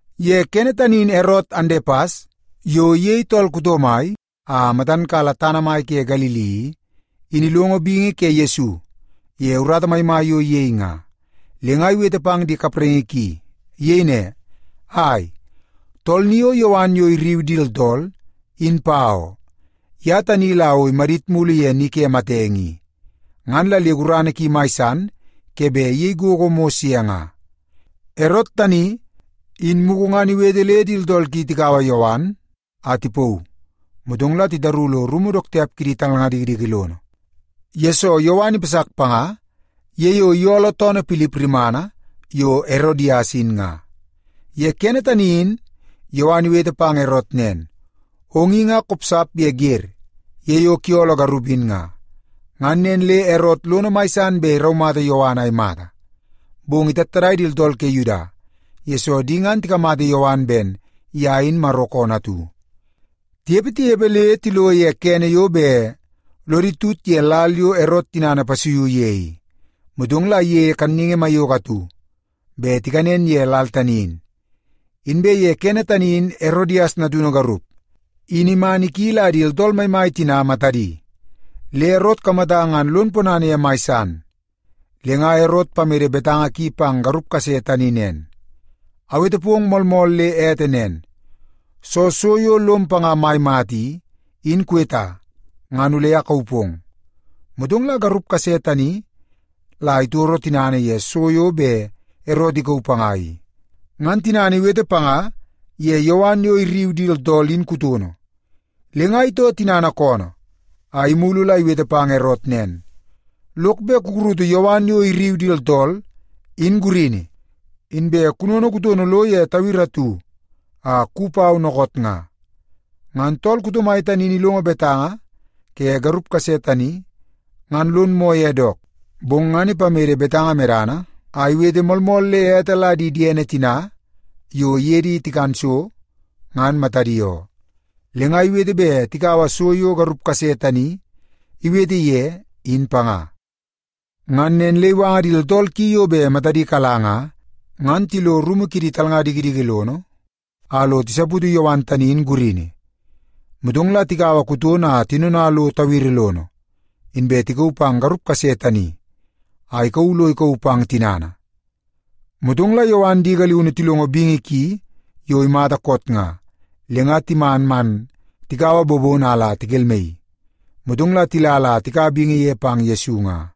Ye kene tani in Erot Andepas yo iyei tool kuto mai a matan kala tana mai ke Galili i, in ilongo bingi ke Yesu ye urata maimai yo iyei nga, le nga iwete pang di kapraingi ki. Iyei ne, “Ai, tool ni o Yowan yo irriu di tooltool, in pa oo. Ye tani la o imadit mulu ye ni ke matenge i, ngan la le gurana ki mai san ke bet iyei gogo mos ye nga.” Erot tani, in mugu ngan iwete le di tooltool ki tikaua Yowan a tipauu, motong la titaru lo rumu dook tiap kidi talnga dikidiki lono, yesoo Yowan ipasak panga ye yo iyooloo toonoo Pilip rimana yo Erodias in nga. Ye kene tani in Yowan iwete pang Erot nen, “Ong i nga kopsap ye wer ye yo kuyooloo garup in nga.” Ngan nen le Erot lono mai san bet iraumata Yowan a imata, bong itattadai di tooltool ke Yuda, yesoo di ngan tikamata Yowan ben ye in Maro koonoo atu. Tinepe, tinepe, le tilo ye kene yo bet lodi tut ye lal yo Erot tinana ipasuiu ye i, motong la iyeie kanningi maiyoko atu bet tikanen ye lal tani in. Inbe ye kene tani in Erodias natunu garup, in man iki la di tooltool maimai tina matadi, le Erot ikamata ngan lon ponana ye mai san. Le nga Erot ipamede betanga ki pang garup kase tani nen, “Awete pong moolmool le ete nen. Soo so yo lom panga mai mata i, in kuweta, ngan ole akauu pong.” Motong la garup kase tani la itoro tinana ye so yo bet Erot ikauu panga i, ngan tinana iwete panga ye Yowan yo irriu di tooltool in kutono. Le nga itoo tinana koonoo a imulu la iwete pang Erot nen, “Lok bet kukurutu Yowan yo irriu di tooltool, in gurini, inbe kunono kutono lo ye tawiri atu a kuwi pau dookoot nga.” Ngan tool kuto mai tani in ilongo betanga ke garup kase tani ngan lon moo ye dook. Bong ngan ipamede betanga medana a iwete moolmool le ete la di diene tina yo iye di tikan so, ngan matadi oo, le nga iwete bet tikaua so yo garup kase tani iwete ye, in panga. Ngan nen le iwanga di tooltool ki yo bet matadi kala nga, ngan tilo rumu kidi talnga dikidiki lono a lo tisaputu Yowan tani in gurini. Motong la tikaua kutono a tinona lo tawiri lono, inbe tikauu pang garup kase tani a ikauu lo ikauu pang tinana. Motong la Yowan di galiunu tilongo bingi ki yo imata koot nga, le nga timan man tikaua bobono a la tikelmaii. Motong la tila la tikaua bingi ye pang Yesu nga.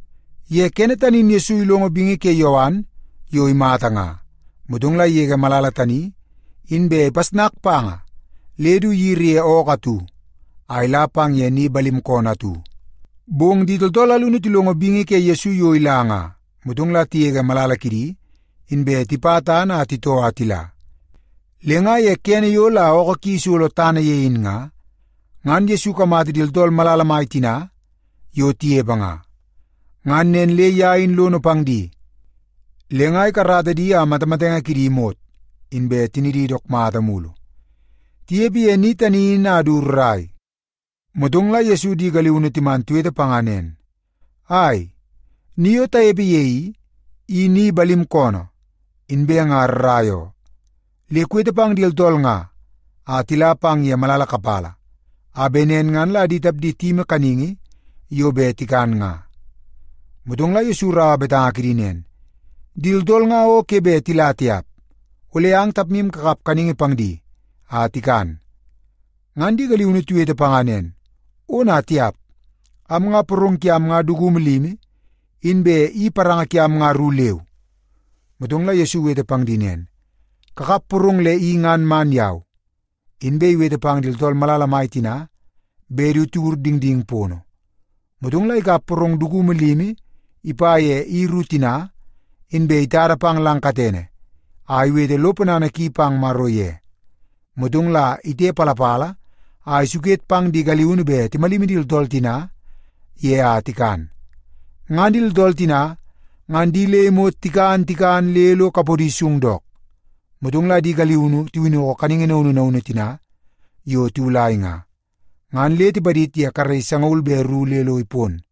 Ye kene tani in Yesu ilongo bingi ke Yowan yo imata nga, motong la igege malala tani, inbe ipasnaka panga le du iyiri ye ookoo atu a ila pang ye ni balim koonoo atu. Bong di tooltool alunu tilongo bingi ke Yesu yo ila nga, motong la tigege malala kidi, inbe tipa tana a titoo a tila. Le nga ye kene yo la ookoo ki isolo tana ye in nga, ngan Yesu ikamata di tooltool malala mai tina yo tinepe nga. Ngan nen le ye in lono pang di, le nga ikarata di a matamatenge kidi imot, inbe tinidi dook mata mulu. Tinepe ye ni tani in a du rrai, motong la Yesu di galiunu timan tiwete panga nen, “Ai, ni yo tanepe ye i, i ni balim koonoo, inbe nga rrai oo. Le kuwete pang di tooltool nga a tila pang ye malala kapala, a bet nen ngan la di tapdi tiyimi kaningi yo bet tikan nga.” Motong la Yesu iraua betanga kidi nen, “Di tooltool nga o ke bet tila tiap. Ole ang tapmu kakap kaningi pang di a tikan.” Ngan di galiunu tiwete panga nen, “Ona tiap! Am nga porong kiam nga dukumu limi, inbe i paranga kiam nga ru leu.” Motong la Yesu iwete pang di nen, “Kakap porong le i ngan man yau.” Inbe iwete pang di tooltool malala mai tina bet du tiwur dingding pono. Motong la ikap porong dukumu limi ipa ye i ru tina, inbe itada pang lang katene a iwete lo ponana ki pang Maro ye. Motong la itepalapala a isuket pang di galiunu bet timalimi di tooltool tina ye a tikan. Ngan di tooltool tina ngan di le imot tikan tikan le lo kapodi sung dook. Motong la di galiunu tiwinnoko kaningi naunu naunu tina yo tiwulai nga, ngan le tipadid ye karei sangaul be ru le lo ipon.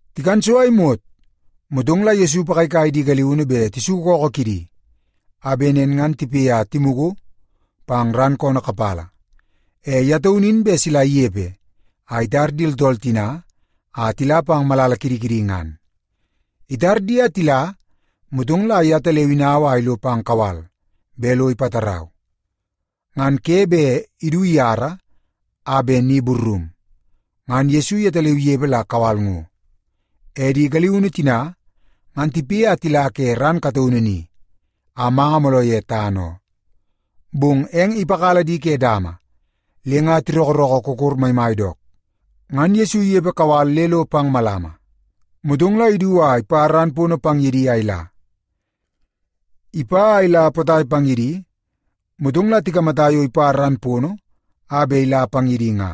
Tikan so a imot, motong la Yesu ipagaigai di galiunu bet tisuku ookoo kidi, a bet nen ngan tipoi a timugu pang ran koonoo kapala. E ye taunu in bet sila inepe a itar di tooltool tina a tila pang malala kidi kidi ngan. Itar di a tila, motong la yetaleu inau a ilo pang kawal bet lo ipatarau. Ngan ke bet idu iyara a bet ni burrum, ngan Yesu yetaleu inepe la kawal ngo. E di galiunu tina ngan tipoi a tila ke ran kataunu ni, a manga mooloo ye tana oo. Bong eng ipakala di ke dama le nga tirookoorookoo kokor maimai dook. Ngan Yesu inepe kawal le lo pang malama, motong la idu a ipa ran pono pang ye di a ila. Ipa a ila potai pang ye di, motong la tikamata yo ipa ran pono a bet ila pang ye di nga.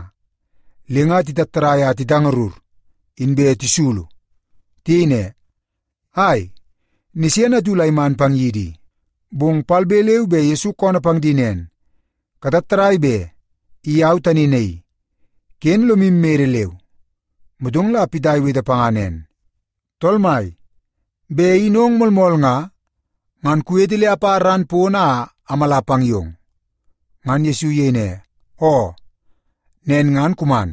Le nga titattadai a titangarur, inbe tisulu. Tiyei ne, “Ai, nisene atu la iman pang yidi i!” Bong palbe leu be Yesu koonoo pang di nen, “Katattadai be! I au tani naii. Ken lomu mede leu.” Motong la Pita iwete panga nen, “Tool Mai, bet in ong moolmool nga, ngan kuwete le apa ran pono a amala pang yong.” Ngan Yesu iyei ne, “Oo, nen ngan kuman.”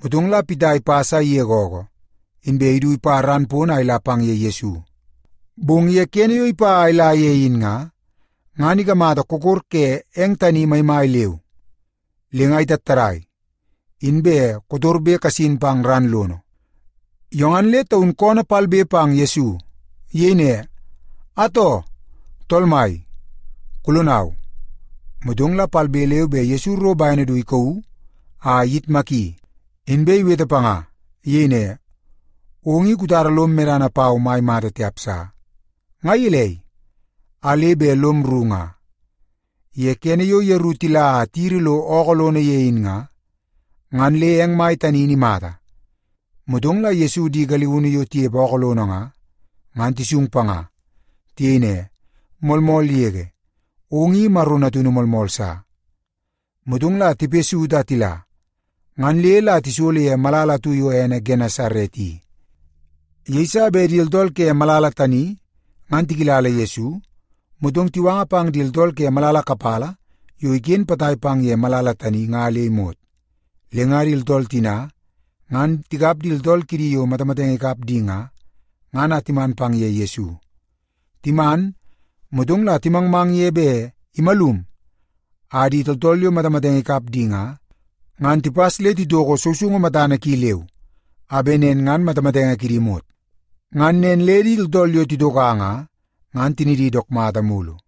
Motong la Pita ipas a igege ookoo, inbe idu ipa ran pono a ila pang ye Yesu. Bong ye kene yo ipa a ila ye in nga, ngan ikamata kokor ke eng tani maimai leu, le nga itattadai, inbe kotorbe kasin pang ran lono. Yo ngan le taun koonoo palbe pang Yesu. Iyei ne, “Atoo, Tool Mai, kulonau!” Motong la palbe leu be Yesu iro bene du ikauu a iyitmaki, inbe iwete panga. Iyei ne, “Ong i kutara lom medana pau mai mata tiap sa! Nga gelei, a le bet lom rru nga?” Ye kene yo yeru tila a tiyiri lo ookoo lono ye in nga, ngan le eng mai tani in imata. Motong la Yesu di galiunu yo tinepe ookoo lono nga, ngan tisung panga. Tiyei ne, “Moolmool yege, ong i Maro Natunu moolmool sa.” Motong la tipoi saut a tila, ngan le la tisolo ye malala atu yo ene Genesaret i. Yeiso bet di tooltool ke malala tani ngan tikilala Yesu, motong tiwanga pang di tooltool ke malala kapala yo iken potai pang ye malala tani nga le imot. Le nga di tooltool tina ngan tikap di tooltool kidi yo matamatenge ikap di nga, ngan a timan pang ye Yesu. Timan, motong la timangmang ye bet imalum a di tooltool yo matamatenge ikap di nga, ngan tipas le titoko sousoungu matana ki leu, a bet nen ngan matamatenge kidi imot. Ngan nen le di tooltool yo titoka nga, ngan tinidi dook mata mulu.